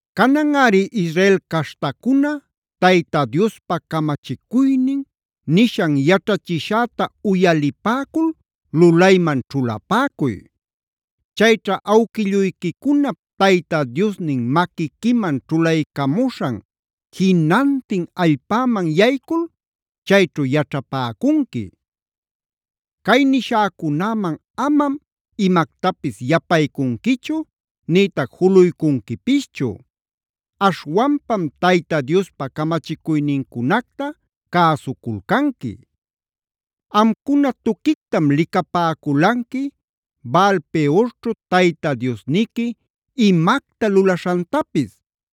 “Cananꞌari Israel caśhtacuna, Tayta Diospa camachicuynin, nishan yaćhachishäta uyalipäcul lulayman ćhulapäcuy. Chayćha awquilluyquicunap Tayta Diosnin maquiquiman ćhulaycamuśhan jinantin allpäman yaycul chayćhu yaćhapäcunqui. Cay nishäcunäman amam imactapis yapaycunquichu nïtac juluycunquipischu.a Aśhwanpam Tayta Diospa camachicuynincunacta cäsuculcanqui. Amcuna tuquictam licapäculanqui Baal-peorćhu Tayta Diosniqui imacta lulaśhantapis.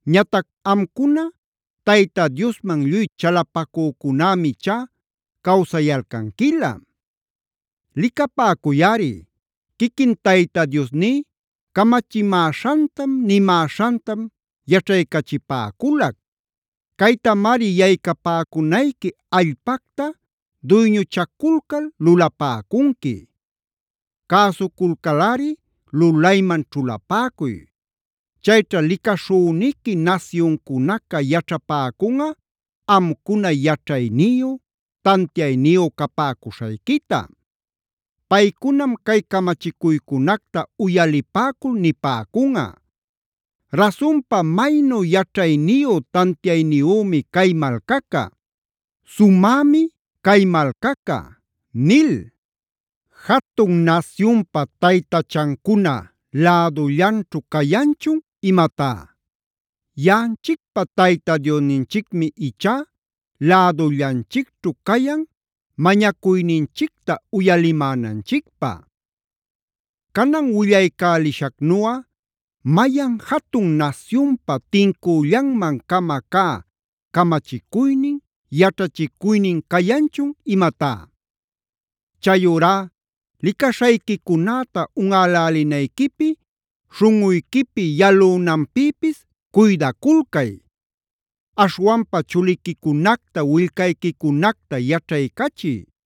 Ñatac amcuna Tayta Diosman lluy chalapacücunämi ichá cawsayalcanquilä. Licapäcuyꞌari, quiquin Tayta Diosní camachimäśhantam, nimäśhantam yaćhaycachipäculac. Caytamari yaycapäcunayqui allpacta duyñuchaculcal lulapäcunqui. Cäsuculcalꞌari lulayman ćhulapäcuy. Chayćha licaśhüniqui nasyuncunaca yaćhapäcunꞌa amcuna yaćhayniyu, tantiayniyu capäcuśhayquita. Paycunam cay camachicuycunacta uyalipäcul nipäcunꞌa: ‘Rasunpa maynu yaćhayniyu tantiayniyümi cay malcaca; sumämi cay malcaca’ nil. ¿Jatun nasyunpa taytachancuna lädullanćhu cayanchun imatá? Yaꞌanchicpa Tayta Diosninchicmi ichá lädullanchicćhu cayan mañacuyninchicta uyalimänanchicpä. Canan willaycälishacnuꞌa, ¿mayan jatun nasyunpa, tincüllanman-cama cä camachicuynin, yaćhachicuynin cayanchun imatá? Chayurá licaśhayquicunäta unꞌälälinayquipi, śhunꞌuyquipi yalünanpïpis cuydaculcay. Aśhwanpa chuliquicunacta, willcayquicunacta, yaćhaycachiy.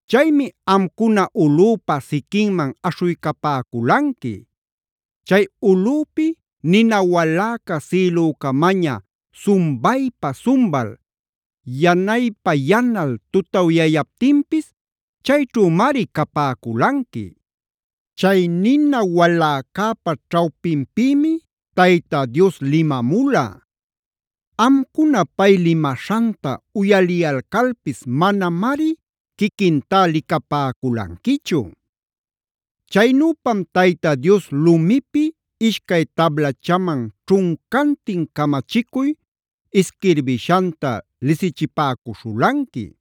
Chaymi amcuna ulꞌüpa siquinman aśhuycapäculanqui. Chay ulꞌüpi nina waläca sïlücamaña sumbaypa-sumbal, yanaypa-yanal tutawyayaptinpis chayćhümari capäculanqui. Chay nina waläcäpa ćhawpinpïmi Tayta Dios limamula.c Amcuna pay limaśhanta uyaliyalcalpis manamari quiquintá licapäculanquichu. Chaynüpam Tayta Dios lumipi ishcay tablachaman ćhuncantin camachicuy isquirbishanta lisichipäcuśhulanqui.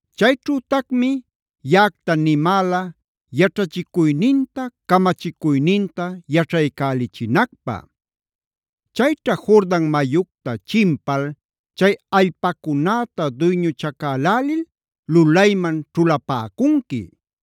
Chayćhütacmi yaꞌacta nimäla yaćhachicuyninta, camachicuynintae yaćhaycälichinacpä. Chayćha Jordan mayucta chimpal chay allpacunäta duyñuchacälälil lulayman ćhulapäcunqui.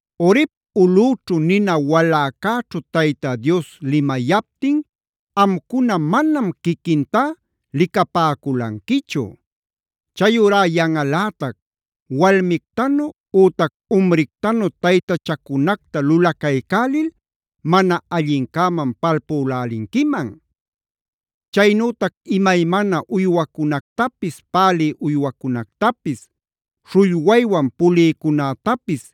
“Horeb ulꞌüćhu nina waläcäćhu Tayta Dios limayaptin amcuna manam quiquintá licapäculanquichu. Chayurá yanꞌalätac, walmictanu ütac umrictanu taytachacunactaf lulacaycälil mana allincäman palpülälinquiman. Chaynütac imaymana uywacunactapis, pälï uywacunactapis, śhullwaywan pulïcunätapis,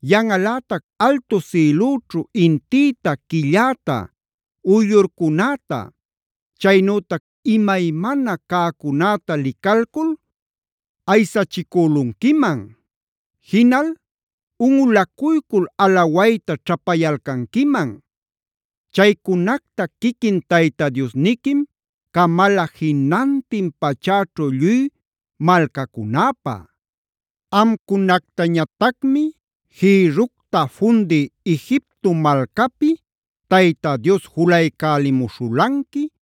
Yanꞌalätac altu sïlućhu intïta, quilläta uyllurcunäta, chaynütac imaymana cäcunäta licalcul aysachicülunquiman; jinal unꞌulacuycul alawayta ćhapayalcanquiman. Chaycunacta quiquin Tayta Diosniquim camala jinantin pachäćhu lluy malcacunäpä. Amcunactañatacmi jïrructa fundï Egipto malcapi Tayta Dios julaycälimuśhulanqui,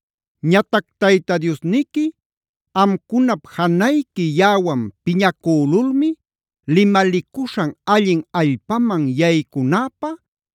Ñatac Tayta Diosniqui amcunap janayqui yaꞌawan piñacülulmi limalicuśhan allin allpaman yaycunäpä,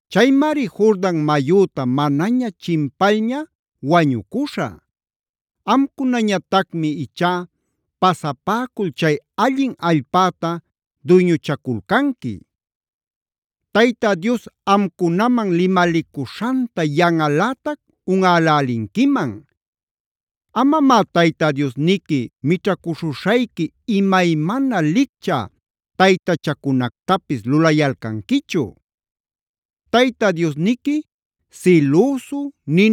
Chaymari Jordan mayüta manaña chimpalña wañucuśhä. Amcunañatacmi ichá pasapäcul chay allin allpäta duyñuchaculcanqui. Tayta Dios amcunaman limalicuśhanta yanꞌalätac unꞌälälinquiman. Amamá Tayta Diosniqui mićhacuśhuśhayqui imaymana liccha taytachacunactapis lulayalcanquichu. Tayta Diosniqui silüsu,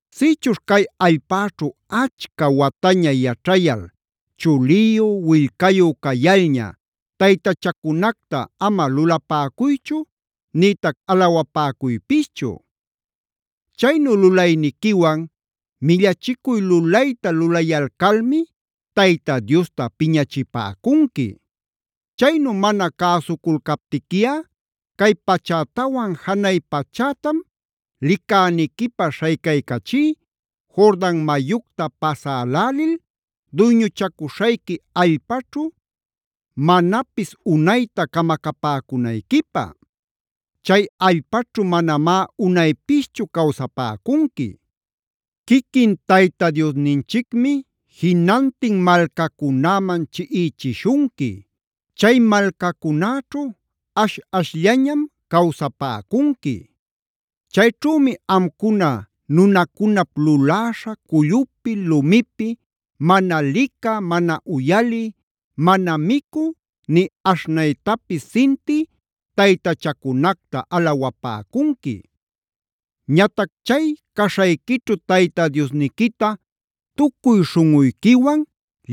“Sïchuśh cay allpäćhu achca wataña yaćhayal chuliyu, willcayu cayalña taytachacunacta ama lulapäcuychu nïtac alawapäcuypischu. Chaynu lulayniquiwan millachicuy lulayta lulayalcalmi Tayta Diosta piñachipäcunqui. Chaynu mana cäsuculcaptiquiꞌa cay pachätawan janay pachätam licäniquipä śhaycaycachí, Jordan mayucta pasälälil duyñuchacuśhayqui allpaćhu manapis unayta camacapäcunayquipä. Chay allpaćhu manamá unaypischu cawsapäcunqui. Quiquin Tayta Diosninchicmi jinantin malcacunäman chiꞌichishunqui; chay malcacunäćhu ash-ashllañam cawsapäcunqui. Chayćhümi amcuna nunacunap luläśha cullupi, lumipi,k mana licä, mana uyalï, mana micü ni aśhnaytapis sintï taytachacunacta alawapäcunqui. Ñatac chay caśhayquićhu Tayta Diosniquita tucuy śhunꞌuyquiwan,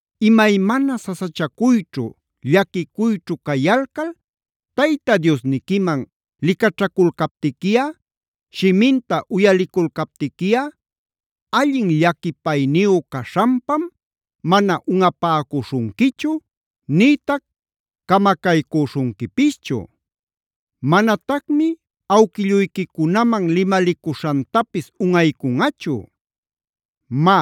Imaymana sasachacuyćhu, llaquicuyćhu cayalcal Tayta Diosniquiman licaćhaculcaptiquiꞌa, shiminta uyaliculcaptiquiꞌa, allin llaquipayniyu caśhanpam mana unꞌapäcuśhunquichu nïtac camacaycüśhunquipischu; manatacmi awquilluyquicunaman limalicuśhantapis unꞌaycunꞌachu. “Má,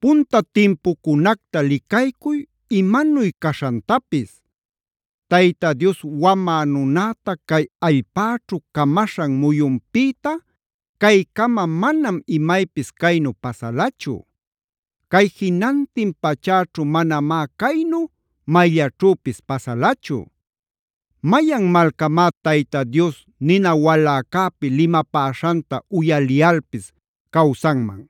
punta timpucunacta licaycuy imanuy caśhantapis; Tayta Dios wamä nunäta cay allpäćhu camaśhan muyunpïta caycama manam imaypis caynu pasalachu. Cay jinantin pachäćhu manamá caynu mayllaćhüpis pasalachu. Mayan malcamá Tayta Dios nina waläcäpi limapäśhanta uyaliyalpis cawsanman.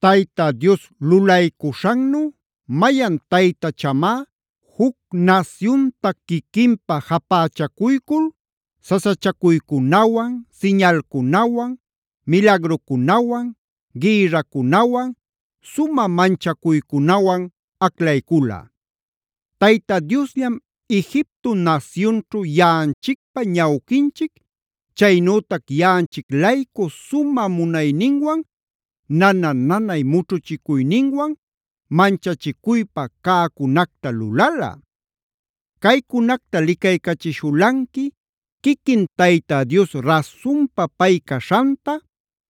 ¿Tayta Dios lulaycuśhannu mayan taytachamá juc nasyunta quiquinpä japächacuycul sasachacuycunawan, siñalcunawan, milagrucunawan, gïrracunawan, sumä manchaycunawan aclaycula? Tayta Diosllam Egipto nasyunćhu yaꞌanchicpa ñawquinchic, chaynütac yaꞌanchic-laycu sumä munayninwan, nana-nanay mućhuchicuyninwan, manchachicuypa cäcunacta lulala. Caycunacta licaycachishulanqui quiquin Tayta Dios rasunpa pay caśhanta,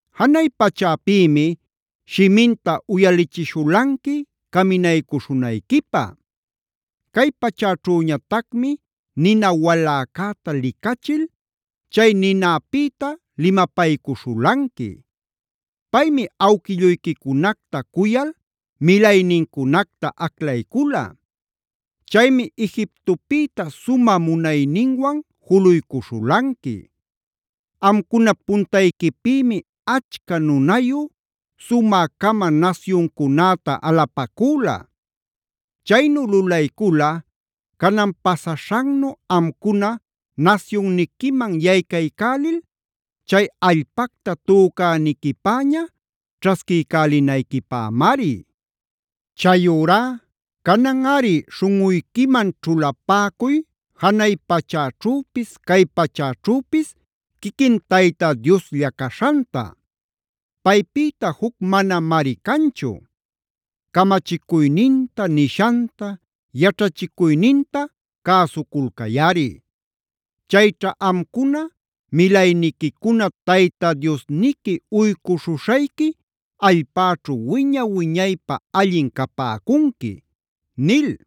Janay pachäpïmi shiminta uyalichishulanqui caminaycuśhunayquipä. Cay pachäćhüñatacmi nina waläcäta licachil, chay ninapïta limapaycuśhulanqui. Paymi awquilluyquicunacta cuyal milaynincunacta aclaycula. Chaymi Egiptopïta sumä munayninwan juluycuśhulanqui. Amcunap puntayquipïmi achca nunayu, sumä-cama nasyuncunäta alapacüla. Chaynu lulaycula canan pasaśhannu amcuna nasyunniquiman yaycaycälil chay allpacta tücäniquipäña ćhasquiycälinayquipämari. “Chayurá cananꞌari śhunꞌuyquiman ćhulapäcuy janay pachäćhüpis cay pachäćhüpis quiquin Tayta Dioslla caśhanta. Paypïta juc manamari canchu. Camachicuyninta, nishanta, yaćhachicuyninta cäsuculcayꞌari. Chayćha amcuna, milayniquicuna Tayta Diosniqui uycuśhuśhayqui allpäćhu wiña-wiñaypä allin capäcunqui” nil.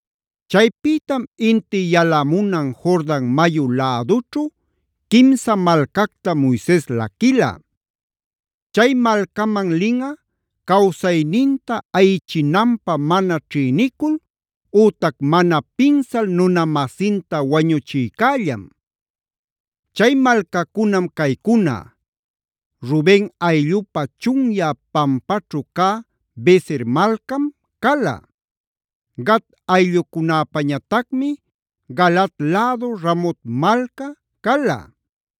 Chaypïtam inti yalamunan Jordan mayu lädućhu quimsa malcacta Moises laquila. Chay malcaman linꞌa cawsayninta ayichinanpä mana ćhïnicul ütac mana pinsal nuna-masinta wañuchïcällam. Chay malcacunam caycuna: Ruben ayllupä chunyä pampaćhu cä Beser malcam cala. Gad ayllucunapäñatacmi Galaad lädu Ramot malca cala.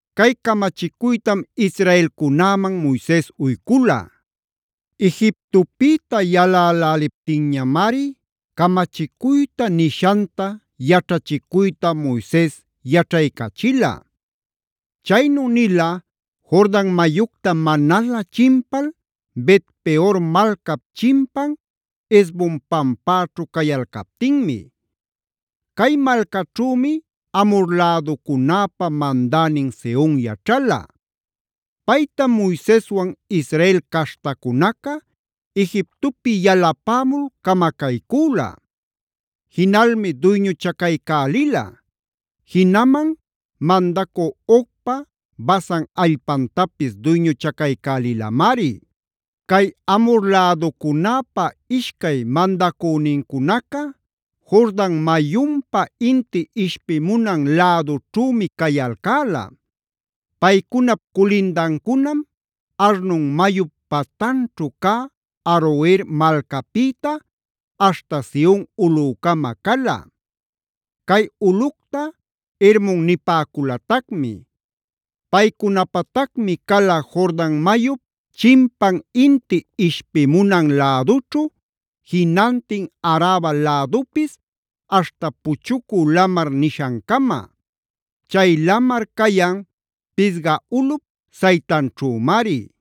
Cay camachicuytam israelcunäman Moises uycula. Egiptopïta yaläläliptinñamari camachicuyta, nishanta, yaćhachicuyta Moises yaćhaycachila. Chaynu nila Jordan mayucta manalä chimpal, Bet-peor malcap chimpan Hesbon pampäćhu cayalcaptinmi. Cay malcaćhümi Amhor läducunäpä mandänin Sehon yaćhala. Paytam Moiseswan Israel caśhtacunaca Egiptopi yalapämul camacaycüla. Jinalmi duyñuchacaycälila; jinaman mandacü Ogpa Basan allpantapis duyñuchacaycälilamari. Cay Amhor läducunäpa ishcay mandacünincunaca Jordan mayunpa inti ishpimunan lädućhümi cayalcäla. Paycunap culindancunam Arnon mayup patanćhu cä Aroer malcapïta aśhta Sion ulꞌücama cala; cay ulꞌucta Hermon nipäculatacmi. Paycunapatacmi cala Jordan mayup chimpan inti ishpimunan lädućhu jinantin Araba lädupis aśhta Puchucu Lamar nishancama; chay lamar cayan Pisga ulꞌup saytanćhümari.